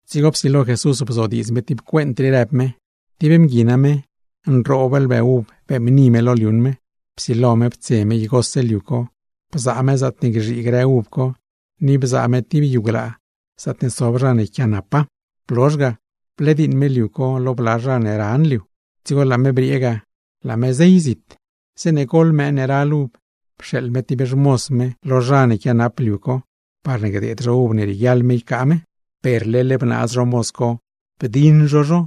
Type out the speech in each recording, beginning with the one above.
Dzigo psilo Jesús bzodiidz me tib cuent, rëb me: ―Tib mgui name, nroob lbë uv beeṉbni me lo liuṉ me. Psilo me ptse me igose liu co, bzaa me zaatne gzhii grë uv co, ni bzaa me tib yu glaa zaatne sob zha ne yquiaanapa. Blozh ga, blediiṉ me liu co lo bla zha ne ran liu, dzigo laa me briee ga, laa me zey zit. ’Zeeṉe goḻ mëë ne ral uv, pxeeḻ me tib xmoz me lo zha ne quianap liu co, parne gdeed zho uv ne rieguiaḻ me ycaa me. Per leḻ bnaaz zho moz co, bdiṉ zho zho;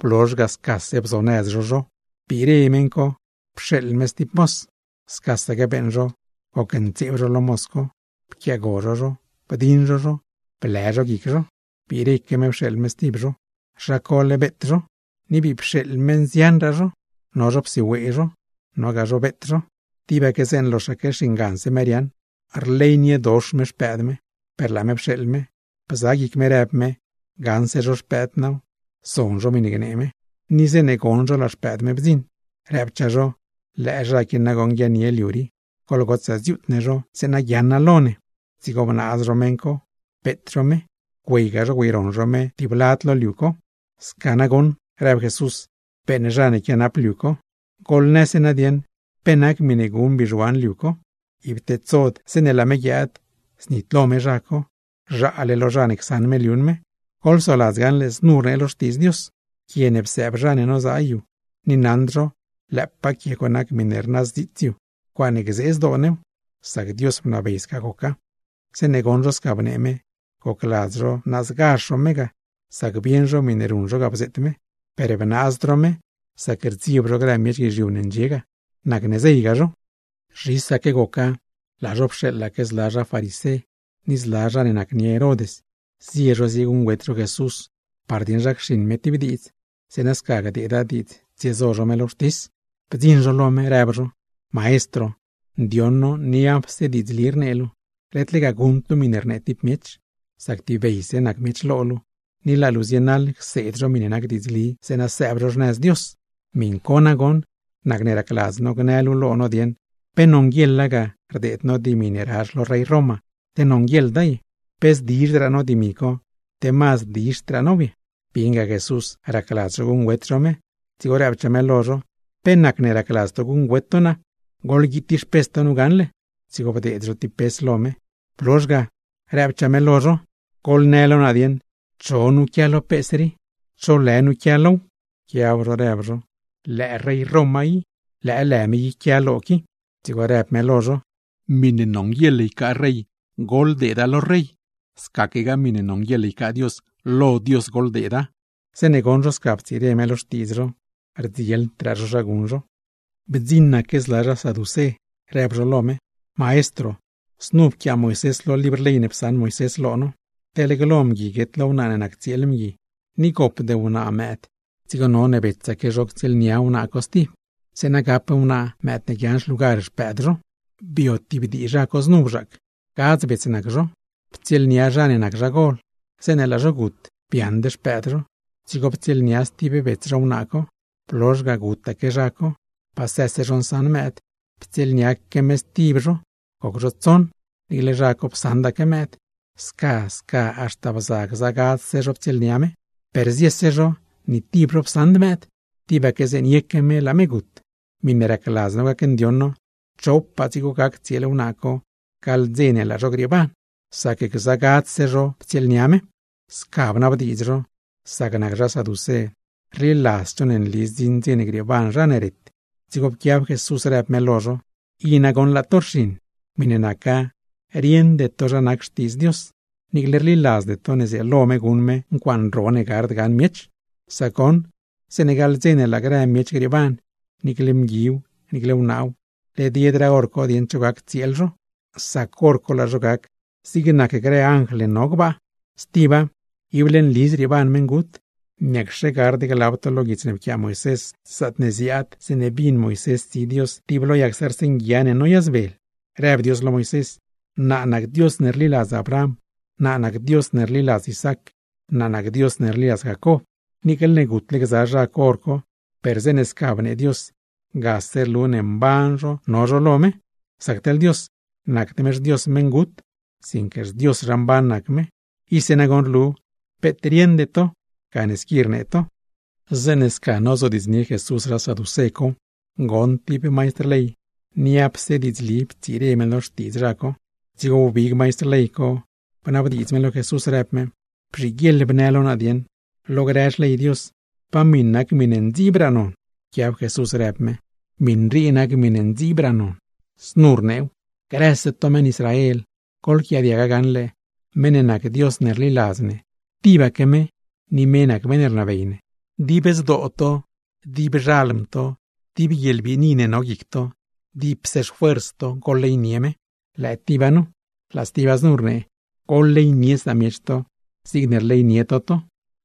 blozh ga, scase bzonëz zho zho. ’Dzigo biire meṉ ne naccheṉ liu co pxeeḻ me stib moz, scasaque beeṉ zho: gocntseeb zho lo moz co, pquiaago zho zho, bdiṉ zho zho, blë zho guic zho. ’Biireque me pxeeḻ me stib zho, zha cole beet zho. Ni bii pxeeḻ me nzianraa zho, no zho psiwee zho, nogaa zho beet zho. Tibaque zeeṉe loxaque xinganse me riaaṉ. Rleyniedox me xpëëd me, per laa me pxeeḻ me, bza guic me rëb me: “Gaṉse zho xpëëd naaw, zon zho miṉe gnee me.” ’Zeeṉe goṉ zho laa xpëëd me bdziṉ, rëbchaa zho: “¡Lëë zha qui nagoṉ guiaaṉnie liu rii! ¡Goḻgotsaa dziuut ne zho zeeṉe guiaaṉa lo ne!” Dzigo bnaaz zho meṉ co, beet zho me, güeyga zho güeyroṉ zho me tib lad lo liu co. ’Sca nagoṉ ―rëb Jesús―, beeṉ zha ne quianap liu co. Goḻnëse nadieṉ, ¿pe nac miṉe guṉ bizhuan liu co? Ib tedsod zeeṉe laa me guiaad, znitlo me zha co; zhaale lo zha ne csaṉ me liuṉ me. ’Goḻsoladz gaṉle znu rnee lo Xtiidz Dios: Quie ne psëëb zha ne nozaa yu, ni naṉd zho lëëpaa quie co nac miṉe rnazdziits yu. ¡Ncuaaṉe gzee zdoo new! Sac Dios bnabey sca goca. Zeeṉe goṉ zho sca bnee me, gocladz zho naazgazh zho me ga; sac bieṉ zho miṉe ruṉ zho ga bzeet me. Per bnaazd zho me, sac rdzieb zho grë miech guizhiu ne ndxie ga, nacne zeyga zho. Zhisaque goca, laa zho pxeeḻaque zla zha farisé, ni zla zha ne nacnie Herod, zie zho zieguṉgüet zho Jesús par dieṉ zha cxiṉ me tib diidz; zeeṉa sca gdeeda diidz tsiezo zho me lo wxtis. Bdziṉ zho lo me, rëb zho: ―Maestro, ndioṉ no niapse diidzli rnee luu, led lega guṉd luu miṉe rnee tib miech, sac tibeyse nac miech lo luu, ni laa luu zienaḻ cseed zho miṉe nac diidzli zeeṉa sëëb zho xnëz Dios. Miṉ co nagoṉ, nacne racladz no gnë luu lo no dieṉ, ¿pe nonguieḻa ga rdeed no dimi ne razh lo rey te nonguieḻda ye? ¿Pe zdizhraa no dimi co, te mazd dizhdraa now ye? Bieṉga Jesús racladz zho guṉgüet zho me, dzigo rëbchaa me lo zho: ―¿Pe nacne racladz to guṉgüet to naa? Goḻguiid tib xpes to nu gaṉle. Dzigo bdeed zho tib pes lo me. Blozh ga, rëbchaa me lo zho: ―Goḻnë lo naa dieṉ, ¿cho nu quia lo pes rii? ¿Cho lë nu quia low? Pquiab zho rëb zho: ―Lëë rey Roma i, lëë lë me i quia low. Dzigo rëb me lo zho: ―Miṉe nonguieḻ ycaa rey, goḻdeeda lo rey; scaquegaa miṉe nonguieḻ ycaa Dios, lo Dios goḻdeeda. Zeeṉe goṉ zho sca ptsire me lo xtiidz zho, rdzieldraa zho zha guṉ zho. Bdziṉaque zla zha saducé, rëb zho lo me: ―Maestro, znu pquiaa Moisés lo libr ley ne psaṉ Moisés lo no: teḻ glo mgui guet lo wnaa ne nac tsieel mgui ni gopd wnaa mëëd, dzigo none betsaque zho ctsieelnia wnaa co stib, zeeṉa gap wnaa mëëd ne guiaaṉ xlugar xpëëd zha ne gut ga. ’Bio tib dii zha co znu bzhaac, gadz bets nac zho. Ptsieelnia zha ne nac zha gol, zeeṉe laa zho gut, biaaṉd xpëëd zho. Dzigo ptsieelnia stib bets zho wnaa co, blozh ga gutaque zha co, pasë zho nsaṉ mëëd. Ptsieelniaque me stib zho, goc zho tsoṉ, niicle zha co psaṉdaque mëëd. Sca sca haxta bza gza gadzse zho ptsieelnia me, per ziese zho ni tib zho psaṉd mëëd; tibaque zeeṉe yeque me, laa me gut. Miṉe racladz no gacndioṉ no, ¿chopaa dzigo gac tsieel wnaa co gaḻ dze ne laa zho grieeban; sac gza gadzse zho ptsieelnia me? Sca bnabdiidz zho, sac nac zha saducé rliladzd zho ne nli zdziṉ dze grieeban zha ne ret. Dzigo pquiab Jesús rëb me lo zho: ―I nagoṉ laa to rxiṉ. Miṉe naca rieṉde to zha nac Xtiidz Dios, niicle rliladzde to zrieelo me guṉ me ncuaaṉ ro ne gard gaṉ miech. Sac goṉ, zeeṉe gaḻ dze ne laa grë miech grieeban, niicle mguiw niicle wnaaw led yedraa hor co dieṉ cho ctsieelnia zho; sac hor co laa zho gac zig nac grë anjl ne no gbaa. Stiba, ible nli zrieeban meṉgut. ¿Pe gard gaṉle glab to lo guits ne pquiaa Moisés, zaatne ziaad zeeṉe bin Moisés tsi Dios tib lo yag zarz nguia ne noyazbel? Rëb Dios lo Moisés: “Naa nac Dios ne rliladz Abraham, naa nac Dios ne rliladz Isaac, naa nac Dios ne rliladz Jacob.” Niicle ne gutle gza zha co hor co, per zeeṉe sca bnee Dios, gase rlu ne mban zho no zho lo me. Sac teḻ Dios, nacd me xDios meṉgut sinque xDios zha mban nac me. Ise nagoṉ rlu, peet rieṉde to gane squi rnee to. Zeeṉe sca nozodiidznie Jesús zha saducé co, goṉ tib maistr ley niapse diidzli ptsire me lo xtiidz zho. Dzigo wbig maistr ley co, bnabdiidz me lo Jesús, rëb me: ―Bzhiguieḻ bnë lo naa dieṉ, lo grë xley Dios, ¿pa miṉ nac miṉe mazdraa non? Pquiab Jesús rëb me: ―Miṉ rii nac miṉe mazdraa non, znu rneew: “Grëse to meṉ Israel, goḻquiaadiaga gaṉle: meṉ ne nac Dios ne rliladz ne, tibaque me ni me nac meṉ ne rnabey ne. Dib zdoo to, dib xalm to, dib guieḻbiini ne no guic to, dipse xfuers to goḻleynie me.” Lëë tiba nu, laa stiba znu rnee: “Bleynie samiech luu zigne rleynie luu luu.”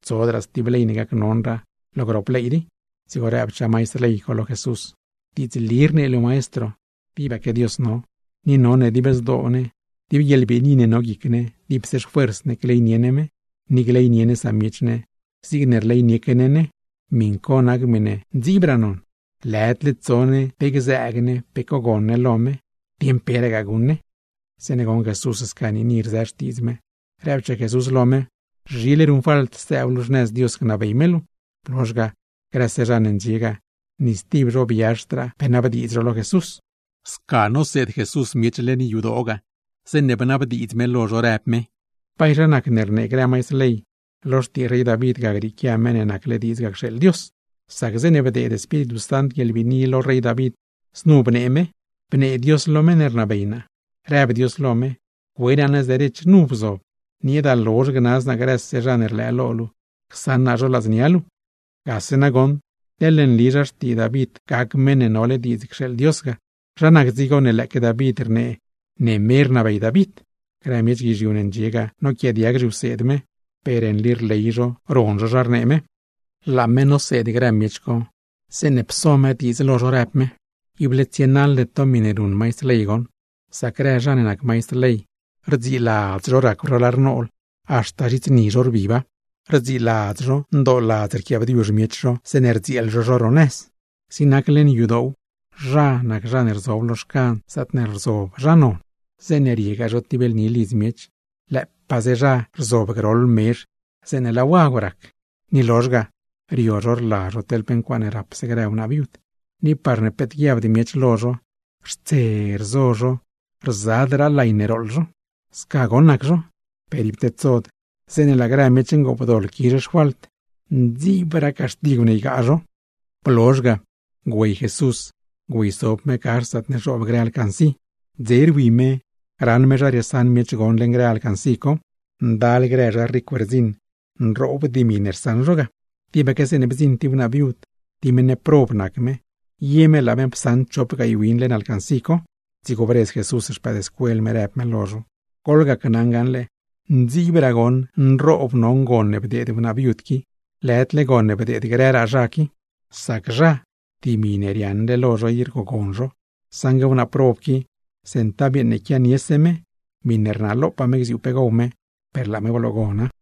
Tsodraa stib ley ne mazdraa non lo grop ley rii. Dzigo rëbchaa maistr ley co lo Jesús: ―Diidzli rnee luu maestro, tibaque Dios no. Ni none dib zdoo ne, dib guieḻbiini ne no guic ne, dipse xfuers ne gleynie ne me; ni gleynie ne samiech ne zigne rleynieque ne ne. Miṉ co nac miṉe mazdraa non, lëdle gzëëg ne pe cos cogon ne lo me o dieṉ peragaa guṉ ne. Zeeṉe goṉ Jesús sca niini rzë xtiidz me, rëbchaa Jesús lo me: ―Zhile ruṉfalt sëëb luu xnëz Dios, gnabey me luu. Blozh ga, grëse zha ne ndxie ga, ni stib zho biazhdraa zho pe nabdiidz zho lo me. Sca noseed Jesús miech leṉ yadoo ga, zeeṉe bnabdiidz me lo zho, rëb me: ―¿Bay zha nacne rnee grë maistr ley, lo xtii rey David ga grieequia Meṉ ne nacle diidz ga cxeeḻ Dios? Sac zeeṉe bdeed Espíritu Sant guieḻbiini lo rey David, znu bnee David: Bnee Dios lo meṉ ne rnabey naa, rëb Dios lo me: “Cue naa nëz derech, nu bzob, nieeda lozh gnaz naa grëse zha ne rlëë lo luu, csaṉ naa zho ladznia luu.” Gase nagoṉ teḻne nli zha xtii David gac Meṉ ne nole diidz cxeeḻ Dios ga, ¿zha nac dzigo ne lëëque David rnee ne me rnabey David? Grë miech guizhiu ne ndxie ga noquiaadiag zhiwseed me, per nli rley zho ron zho zha rnee me. Laa me noseed grë miech co, zeeṉe pso me diidz lo zho rëb me: ―Ible tsienaḻde to miṉe ruṉ maistr ley goṉ. Sac grë zha ne nac maistr ley, rdziladz zho racw zho lar nool haxta zhits ni zho rbiba, rdziladz zho ndooladz yquiaabdiuzh miech zho zeeṉe gdzieel zho zho dib ro nëz. Zig nac leṉ yadoow, zha nac zha ne rzob lo xcan zaatne rzob grë zha non, zeeṉe tsiegaa zho tib lni lidz miech, lëëpaaze zha nac zha ne rzob groḻ mezh zeeṉe laa wagw gac. Ni rlozh ga, rio zho rla zho teḻ pe ncuaaṉe rapse grë wnaa viud; ni parne peet guiabd miech lo zho, xtse rzo zho rzadraa pe lay ne gooḻ zho. ’Sca goṉ nac zho, per ib tedsod zeeṉe laa grë miech ngoopdoḻ quizh xfalt, zha nac zha ne mazdraa nroob caxtigw ygaa. Blozh ga, güey Jesús güeysob me gax zaatne zhoob grë alcancí. Dzese rwi me raṉ me zha riesaṉ miech gon leṉ grë alcancí co; ndal grë zha ricw rdziṉ, nroob dimi rsaṉ zho. Tibaque zeeṉe bdziṉ tib wnaa viud, tib meṉ prob nac me, ye me laa me psaṉ chop gaay win leṉ alcancí co. Dzigo bredz Jesús xpëëdscuel me, rëb me lo zho: ―Gneli naa lo to gaṉle, mazdraa goṉ nroob non gon ne bdeed wnaa viud qui, lëdle gon ne bdeed grëraa zha qui. Sac zha, dimi ne riaaṉle lo zho i rgogon zho; saṉgue wnaa prob qui goṉ, centav yeeṉ ne quianiese me miṉe rnalopaa me gziuu pe gow me, per laa me bloogona.